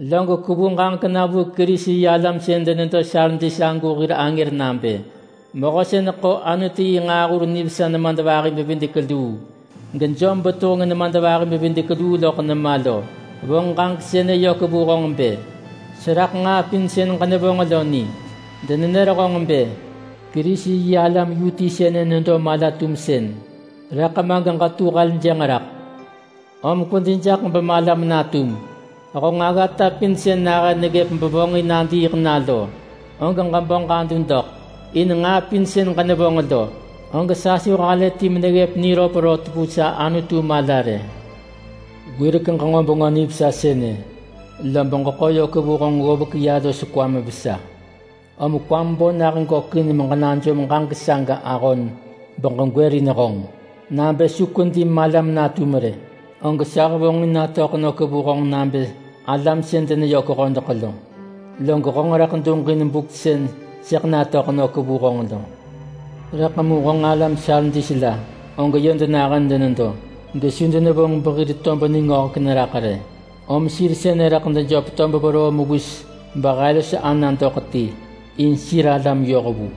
“Log kwevu ġaġek na vu Kerisi-yi-alam sën denedo Sardis agu hir angër nabë: Mehö sën ḳo Anutu yi nġaahur nivesa nemadvahi-bevidek-luu, gejom betuheng nemadvahi-bevidek-luu loḳ nema lo vonġ ġaġek sënë yök vu honġ bë: Seraḳ nġaa pin sën ġenevonġ lo ni. Denenër honġ bë: ‘Kerisi-yi-alam yu ti sënë nedo mala-tumsën’, rëḳ ma geġetu heljënġ raḳ. Om kwedi jaḳ bemalam natum! Honġ aggata pin sën nahën neggëp bevonġin nadiiḳ na lo, og ġebo ġadu doḳ. In nġaa pin sën ġenevonġ lo, og sa su halë ti meneggëp niröp rot vu sa Anutu mala rë. Wirek ġenġo Bengö Nivesa sënë, lob ġeḳo yök vu honġ ggovek ya los kwam vesa. Om kwam bo nah gökin meġenajom ġaġek saga ahon beġegwërin honġ. Nabë su kwedi malam natum rë, og sa hevonġin natöḳ nök vu honġ nabë alam sën deneyök hodeḳ lo, log honġ rëḳ duġin buk sën sëḳ natöḳ nök vu honġ lo. Rëḳ mu honġ alam Sardis la, og yö denahën denedo gesu denevonġ behir tob ningöhek neraḳ rë. Om sir sënë rëḳ dejöp tob veroo mewis behe los ana doḳ ti, in sir alam yohvu.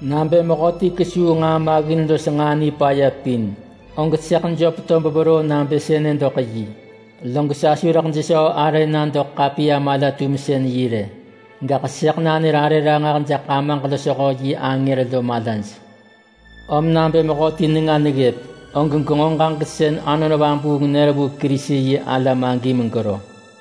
Nabë mehöti kesuu nġaa maggin los nġaa nipaya pin, og sëḳ jöp tob veroo nabë sënë doḳ yi, log sa su rëḳ jesöö arë na doḳ ḳapiya-mala-tumsën-yi rë. Gaḳ sëḳ nanër arë ranġah jaḳ Amaġ losho yi angër lo malaj. Om nabë mehöti nenga neggëp, og genġo ġaġek sën Anon Vabuung nër vu Kerisi-yi-alam agi megero!”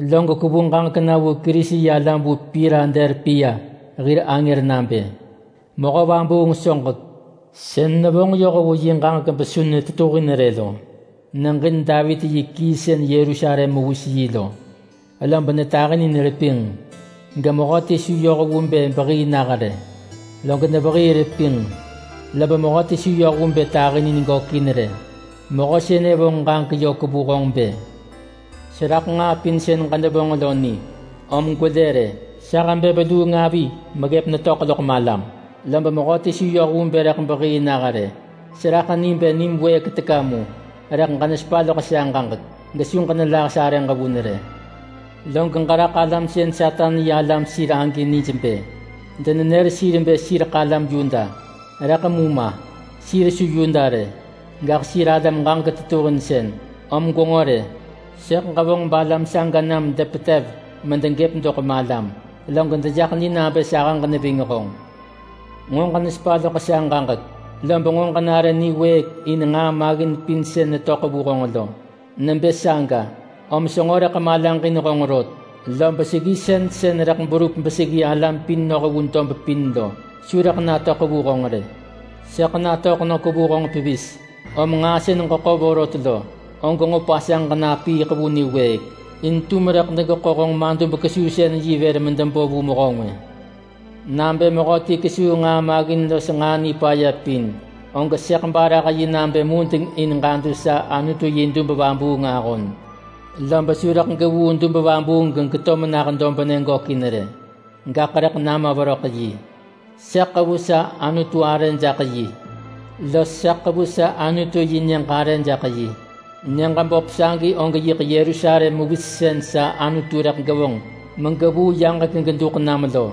“Log kwevu ġaġek na vu Kerisi-yi-alam vu Piladelpia hir angër nabë: Mehö vabuung soġek, sën nevonġ yoh vu yi ġaġek besu netetuhin rë lo, neġin Davit yi kii sën Yerusalem mewis yi lo. Lob netahinin repinġ, gemehöti su yoh vu bë behii nah rë. Log nevehii repinġ, lob mehöti su yoh vu bë tahinin gökin rë. Mehö sënë vonġ ġaġek yök vu honġ bë: Seraḳ nġaa pin sën ġenevonġ lo ni. Om gwelë rë. Sa hebë veluung avi meggëp netöḳ loḳ malam, lob mehöti su yoh vu bë rëḳ behii nah rë. Seraḳ ni bë nim wëëk teka mu, rëḳ ġenesepa loḳ sa ġaġek, gesu ġenelah sarëġ vun rë. Log ġeraḳ alam sën Satan yi alam sir agi nij bë denenër sir bë sireḳ alam Yuda. Rëḳ mu ma! Sir su Yuda rë. Gaḳ sir alam ġaġek tetuhinsën. Om gwenġo rë! Sëḳ ġevonġ balam saga nam depetev medegëp doḳ malam, log dejaḳ ni nabë sahëġ neving honġ. Nġo ġenesepa loḳ sa ġaġek, lob nġo ġenare niwëëk in nġaa maggin pin sën netöḳ vu honġ lo. Nebë saga, om senġo rëḳ malaġin honġ rot, lob seggisën sën rëḳ berup beseggi alam pin noh vu dob pin lo su rëḳ natöḳ vu honġ rë. Sëḳ natöḳ nök vu honġ pevis. Om nġaa sën ġeḳo vorot lo, og nġo pasanġ ġenapiiḳ vu niwëëk. In tum rëḳ degeḳo honġ madub-kesuusën-yi vër medebo vu mehö ngwë. Nabë mehöti kesuu nġaa maggin los nġaa nipaya pin, og sëḳ barah yi nabë mudeng in ġadu sa Anutu yi dub vabuung ahon. Lob su rëḳ gevuu dub vabuung gegeto menah dobnë gökin rë. Gaḳ rëḳ nama veröḳ yi. Sëḳ ḳevu sa Anutu arë jaḳ yi, los sa ḳevu sa Anutu yi nyëġ arë jaḳ yi. Nyëġ böp sagi og yiḳ Yerusalem mewis sën sa Anutu rëḳ gevonġ megevuu yaġek geduḳ nam lo.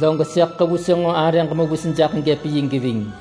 Log sëḳ ḳevu senġo arëġ mewis jaḳ yi geving.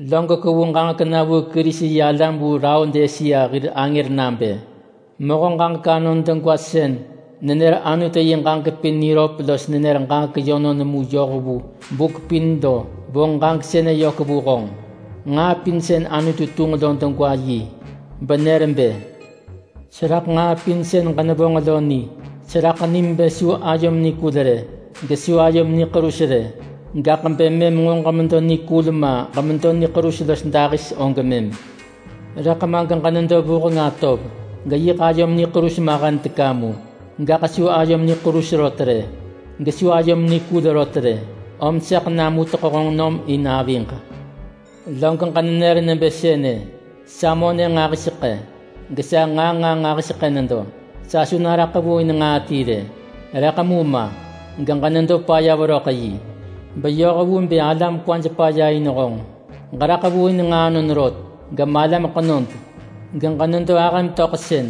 “Log kwevu ġaġek na vu Kerisi-yi-alam vu Laodisea hir angër nabë: Mehö ġaġek anon degwa sën nenër Anutu yi ġaġek pin niröp los nenër ġaġek yönon mu yoh vu buk pin lo vonġ ġaġek sënë yök vu honġ. Nġaa pin sën Anutu tunġ lo degwa yi, benër bë: Seraḳ nġaa pin sën ġenevonġ lo ni. Seraḳ nim bë su ayom nikul rë, gesu ayom niḳerus rë. Gaḳ bë mëm nġo ġemedo nikul ma ġemedo niḳerus los dahis og mëm! Rëḳ ma geġenedo vuheng atov, geyiḳ ayom niḳerus mahen teka mu. Gaḳ su ayom niḳerus rot rë, gesu ayom nikul rot rë. Om sëḳ namuteḳ honġ nom in aviġ. Log ġenenër nebë sënë, ‘Sa monë nġahiseḳë, gesa nġaa nġaa nġahiseḳë nedo. Sa su naraḳ vu in nġaa ti rë.’ Rëḳ mu ma, geġenedo paya veröḳ yi, beyoh vu bë alam kwaj paya in honġ. Ġeraḳ vu in nġaanon rot, gemalam ḳenod, geġenedo ahëm töḳsën,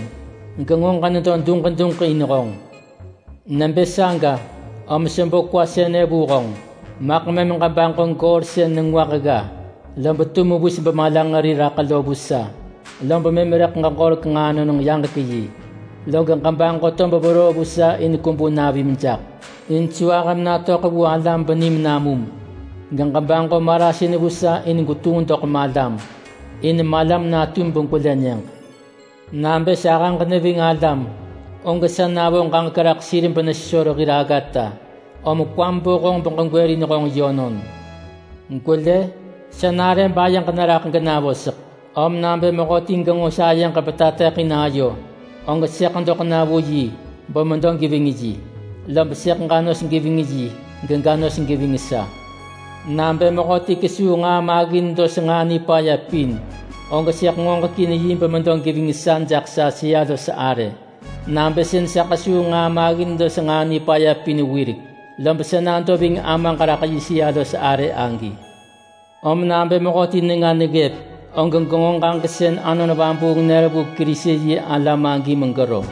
genġo ġenedo duġ duġ in honġ. Nebë saga, om sebo kwa sënë vu honġ: Maḳ mëm ġebaġo goor sën nengwah gga lob tu mewis bemalanġeri raḳ lo vu sa, lob mëm rëḳ ġeġorek nġaanon-yaġek-yi. Log ġebaġo tob veroo vu sa in kwebu navim jaḳ, in su ahëm natöḳ vu alam benim namum. Geġebaġo marasin vu sa in gwetunġ doḳ malam, in malam natum begwelë nyëġ. Nabë sahëġ neving alam, og sa navo ġaġek raḳ sir benesesor hir aggata. Om kwam bo honġ beġegwërin honġ yönon. Gwelë! Sa nare bayeġ neraḳ genavoseḳ, om nabë mehöti genġo sayeġ betateḳin ayo, og sëḳ doḳ na vu yi bemedo geving yi. Lob sëḳ ġa nos geving yi, gega nos geving sa. Nabë mehöti kesuu nġaa maggin los nġaa nipaya pin, og sëḳ ngoġekin yi bemedo geving sa jaḳ sa sëa-los-arë, nabë sën sa ḳesuu nġaa maggin los nġaa nipaya pin wirek, lob sa nado ving Amaġ raḳ yi sëa-los-arë agi. Om nabë mehöti nenga neggëp, og genġo ġaġek sën Anon Vabuung nër vu Kerisi-yi-alam agi megero!”